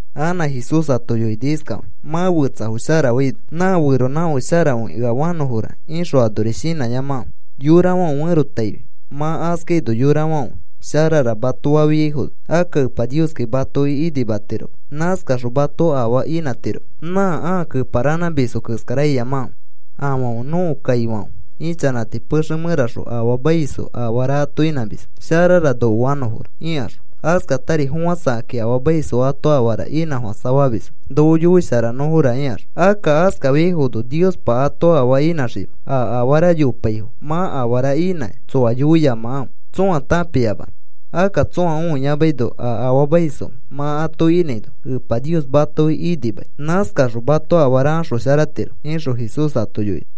Anã Jesús ato yoini iskafakĩ: “Mã fetsafo sharafaino, ‘Nã feronãfake sharakõi ea fanõfora,’ ixõ anori shinãyamakãfe yorafãfe ferotaifi. Mã askaino yorafãfe, ‘Sharara,’ mato fafiaifono, akka Epa Nioskai matoki inimatiroma. Nãskaxõ mato afaa inãtiroma. Nã ãa keparanãmisfo keskara iyamakãfe. Afãfe nõko kaifãfe ichanãti pexe mẽraxõ afaamaisfo afara ato inãmisfo, ‘Sharara noko fanõfora,’ ikaxõ. Askatari fofãsakakĩ afaamaisfo ato afara inãfofãsafamisfo, ‘Noko yoisharanõfora,’ ikaxõ. Akka askafiaifono Niospa ato afaa inãxima. A afara yopaifo mã afara inãkĩ tsoa yoiyamakãfe tsõa tãpiyamanõ. Akka tsõa õiyamaino a afaamaisfo mã ato inãino Epa Nios matoki inimani. Nãskaxõ mato afara axosharatiro,” ixõ Jesús ato yoini.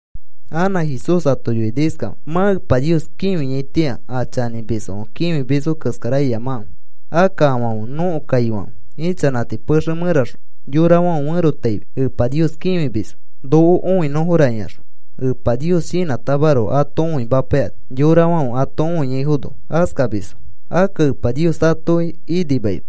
Anã Jesús ato yoini iskafakĩ: “Mã Epa Nios kĩfiaitĩa a chanĩmisfãfe kĩfimisfo keskara iyamakãfe. Akka afãfe nõko kaifãfe ichanãti pexe mẽraxõ yorafãfe ferotaifi Epa Nios kĩfimisfo: ‘Noko õinõfora,’ ikaxõ. Epa Nios shinãtamaroko ato õimapaikani. Yorafãfe ato õiaifono askamisfo. Akka Epa Nios atoki inimaima.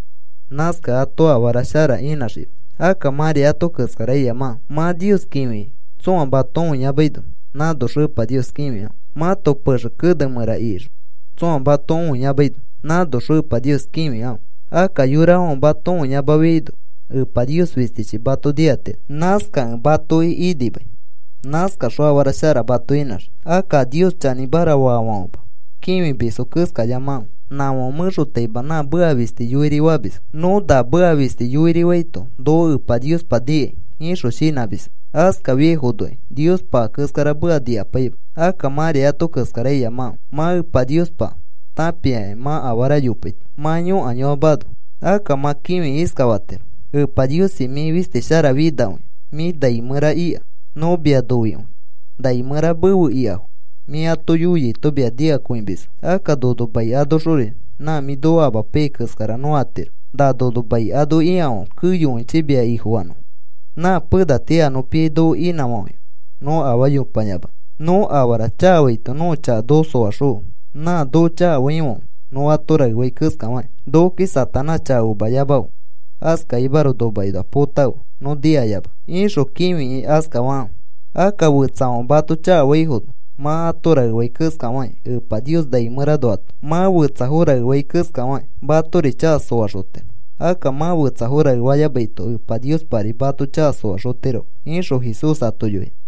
Nãskakẽ ato afara shara inãxiima. Akka mãri ato keskara iyamakãfe. Mã Nios kĩfikĩ tsõa mato õiyamaino nãnoxõ Epa Nios kĩfikãfe. Mãto pexe kene mẽra ikixõ tsõa mato õiyamaino nãnoxõ Epa Nios kĩfikãfe. Akka yorafãfe mato õiyamafiaino Epa Nios fistichi mato nikatiro. Nãskakẽ matoki inimai. Nãskaxõ afara shara mato inãxii. “Akka a Nios chanĩmara faafãfema kĩfimisfo keskayamakãfe. Nãfãfe mẽxotaima nã meka fisti yoiri famisfo. ‘Nõ na meka fisti yoirifaito noko Epa Niospa nikai,’ ixõ shinãmisfo. Askafiaifonokai Niospa a keskara meka nikapaima. Akka mãri ato keskara iyamakãfe. Mã Epa Niospa tãpiakĩ mã afara yopaito, mã yõkayoamano. Akka mã kĩfikĩ iskafatiro: Epa Niosi, mĩ fisti sharafinakõia. Mĩ nai mẽra ika. Nõ mia noikõi. Nai mẽra mefe ikafo mĩ ato yoiaito mia nikakõimisfo. Akka nono mai anoxori nã mĩ noko amapaiyai keskara nõ atiro. Na nono mai ano ikafãfe keyokõichi mia Ifofanõfo. Nã pena tii a nõ piai noko inãfafãife nõ afaa yopayamanõ. Nõ afara chakafaito nõko chaka noko soaxõfe nã noko chakafaifãfe nõ ato raefai keskafakĩ. Nokoki Satanás chaka omayamafe, askakimaroko nomakinoa põtafe nõ nikayamanõ, ixõ kĩfikĩ iskafakãfe. “Akka fetsafãfe mato chakafaifono mã ato raefai keskafakĩ Epa Nios nai mẽranoato mã fetsafo raefai keskafakĩ matori chaka soaxotiro. Akka mã fetsafo raefayamaito Epa Niospari mato chaka soaxotiroma,” ixõ Jesús ato yoini.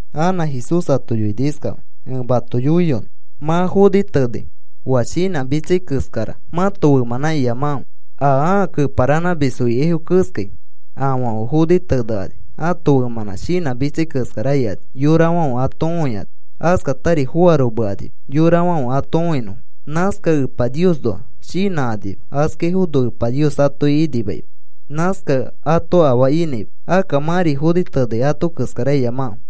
Anã Jesús ato yoini iskafakĩ: “Ẽ mato yoiyonõ. Mã foni tenei oa shinãmitsai keskara mãto femãnã iyamakãfe a ãa keparanãmisfo ikaifo keskai. Afãfe foni tenekani ãto femãnã shinãmitsai keskara ikani yorafãfe ato õikani. Askatari foaromekanima yorafãfe ato õinõfo. Nãskakẽ Epa Niosnoa shinãkanima. Askaifono Epa Nios atoki inimaima. Nãskakẽ ato afaa inãima. Akka mãri foni tenei ato keskara iyamakãfe.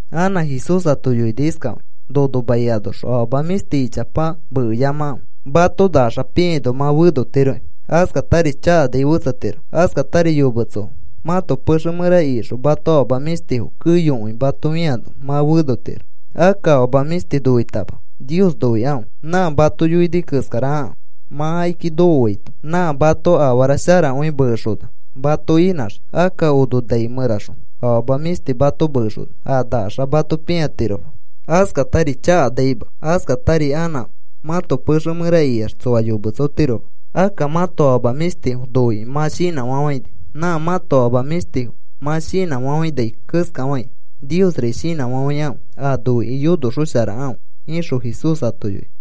Anã Jesús ato yoini iskafakĩ: “Nono mai anoxõ afama mĩshti ichapa mekeyamakãfe. Mato nakaxa pĩaino mã fenotiroki. Askatari chakanai fetsetiro. Askatari yometsofo mãto pexe mẽra ikixõ mãto afama mĩshtifo keyokõi mato fĩano mã fenotiro. Akka afama mĩshti noitama Nios noikãfe. Nã mato yoini keskara akãfe. Mã akiki nokoaito nã mato afara sharakõi mekexona mato inãxii. Akka ono nai mẽraxõ afama mĩshti mato mekexona, a nakaxa mato pĩatiroma. Askatari chakanaima. Askatari anã mãto pexe mẽra ikiax tsoa yometsotiroma. Akka mãto afama mĩshtifo noikĩ mã shinãfafãini. Nã mãto afama mĩshtifo mã shinãfafãinai keskafakĩ Niosri shinãfafãikãfe, a noikĩ yonoxosharakãfe,” ixõ Jesús ato yoini.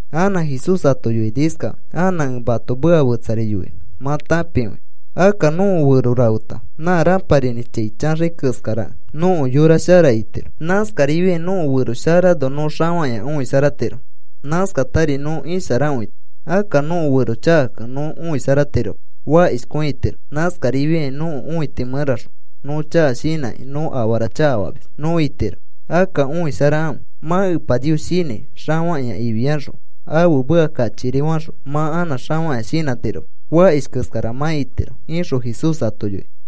Anã Jesús ato yoini iskafakĩ: “Anã ẽ mato meka fetsari yoinõ mã tãpikõinõ. Akka nõko fero rafeta nã rãparinĩ chai chaxai keskarakẽ, nõko yora shara itiro. Nãskarifiai nõko fero sharano nõ xafakĩa õisharatiro. Nãskatari nõ isharakõitiro. Akka nõko fero chakakẽ nõ õisharatiroma. Fakishkõi itiro. Nãskarifiakĩ nõko õiti mẽraxõ nõ chaka shinãkĩ nõ afara chakafamis nõ itiro. Akka õisharakãfe. Mã Epa Nios shinãi xafakĩa ifiaxõ ãfe meka kachikiri faxõ mã anã xafakĩa shinãtiroma. Fakish keskara mã itiro,” ixõ Jesús ato yoini.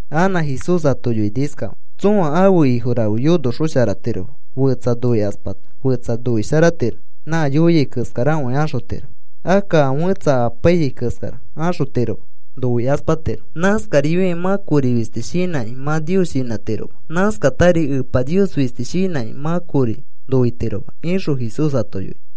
Anã Jesús ato yoini iskafakĩ: “Tsõa ãfe ifo rafe yonosharaxotiroma. Fetsa noikaspata, fetsa noisharatiro, nã yoiai keskarakõi axotiro, akka a fẽtsa amapaiyai keskara axotiroma noikaspatiro. Nãskarifiakĩ mã kori fisti shinãkĩ mã Nios shinãtiroma. Nãskatari Epa Nios fisti shinãkĩ mã kori noitiroma,” ixõ Jesús ato yoini.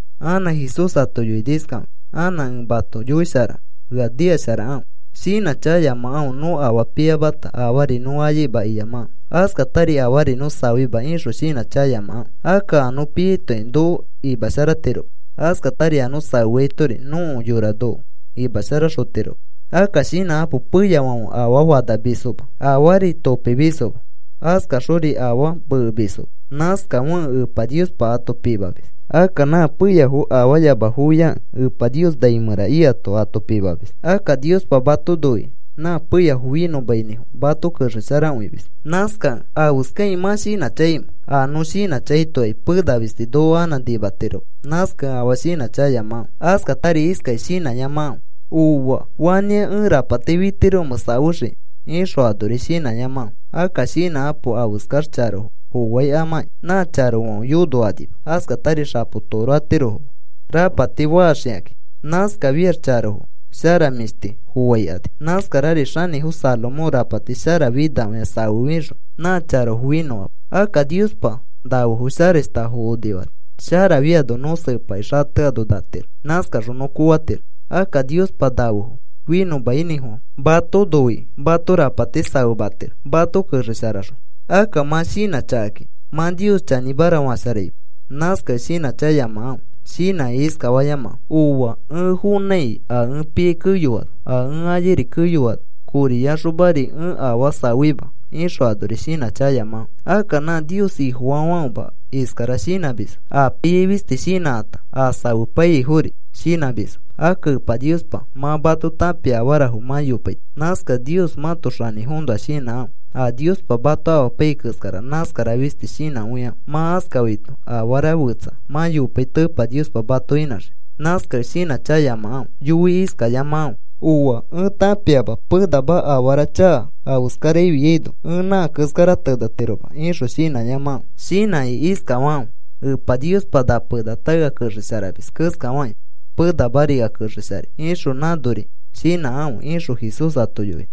Anã Jesús ato yoini iskafakĩ: “Anã ẽ mato yoisharanõ. Ea nikasharakãfe. Shinãchakayamakãfe. Nõ afaa piyamata, afaari nõ ayaima iyamakãfe. Askatari afaari nõ safeima ixõ shinãchakayamakãfe. Akka a nõ piaitokai noko imasharatiroma. Askatari a nõ safeatori nõko yora noko imasharaxotiroma. Akka shinãkapo. Peyafãfe afaa fanamisfoma. Afaari topimisfoma. Askaxori afaa mekemisfoma. Nãskafekẽ Epa Niospa ato pimamis. Akka nã peyafo afaayamafoiakẽ Epa Nios nai mẽra ikato ato pimamis. Akka Niospa mato noikĩ nã peyafo finõmainĩfofã mato kexesharakõimis. Nãskakẽ, ¿afeskakĩ mã shinãchakaimẽ? A nõ shinãchakaitokai pena fisti noko anã nimatiroma. Nãskakẽ afaa shinãchakayamakãfe. “Askatari iskakĩ shinãyamakãfe: ‘Ooa. ¿Fanĩa ẽ rapati fitiromẽ safexiki?’ ixõ anori shinãyamakãfe. Akka shinãkapo afeskax charofo foaikamakĩ. Nã charofãfe yonokanima. Askatari xapo toro atirofoma rapati faxikakĩ. Nãskafiax charofo sharamĩshti foaikani. Nãskarari xanĩfo Salomón rapati sharafinakõia safefixõ nã charofo finõama. Akka Niospa nafefo sharashtafo onifani. Sharafiano nõ sepakĩ xateano natiro. Nãskaxõ nõ koofatiro. Akka Niospa nafefo finõmainĩfofã mato noikĩ mato rapati safematiro mato kexesharaxõ. Akka mã shinãchakakĩ mã Nios chanĩmara fasharaima. Nãskakẽ shinãchakayamakãfe. Shinãkĩ iskafayamakãfe: ‘Ooa. Ẽ fonãiki a ẽ piai keyoano, a ẽ ayairi keyoano koriyaxomari ẽ afaa safeima,’ ixõ anori shinãchakayamakãfe. Akka nã Nios Ifofaifãfema iskara shinãmisfo. A piai fisti shinãkata, a safepaiyaifori shinãmisfo. Akka Epa Niospa mã mato tãpia afarafo mã yopaito. Nãskakẽ Nios mãto xanĩfoõnoa shinãkãfe. A Niospa mato amapaiyai keskara nãskara fisti shinãkõikãfe. Mã askafaito afara fetsa mã yopaito Epa Niospa mato inãxii. Nãskakẽ shinãchakayamakãfe. Yoi iskayamakãfe: ‘Ooa. Ẽ tãpiama penama afara chaka afeskara afiaino. Ẽ nã keskara tenetiroma,’ ixõ shinãyamakãfe. Shinãkĩ iskafakãfe: ‘Epa Niospa na penata ea kexesharamis keskafakĩ penamari ea kexesharai,’ ixõ nãnori shinãkãfe,” ixõ Jesús ato yoini.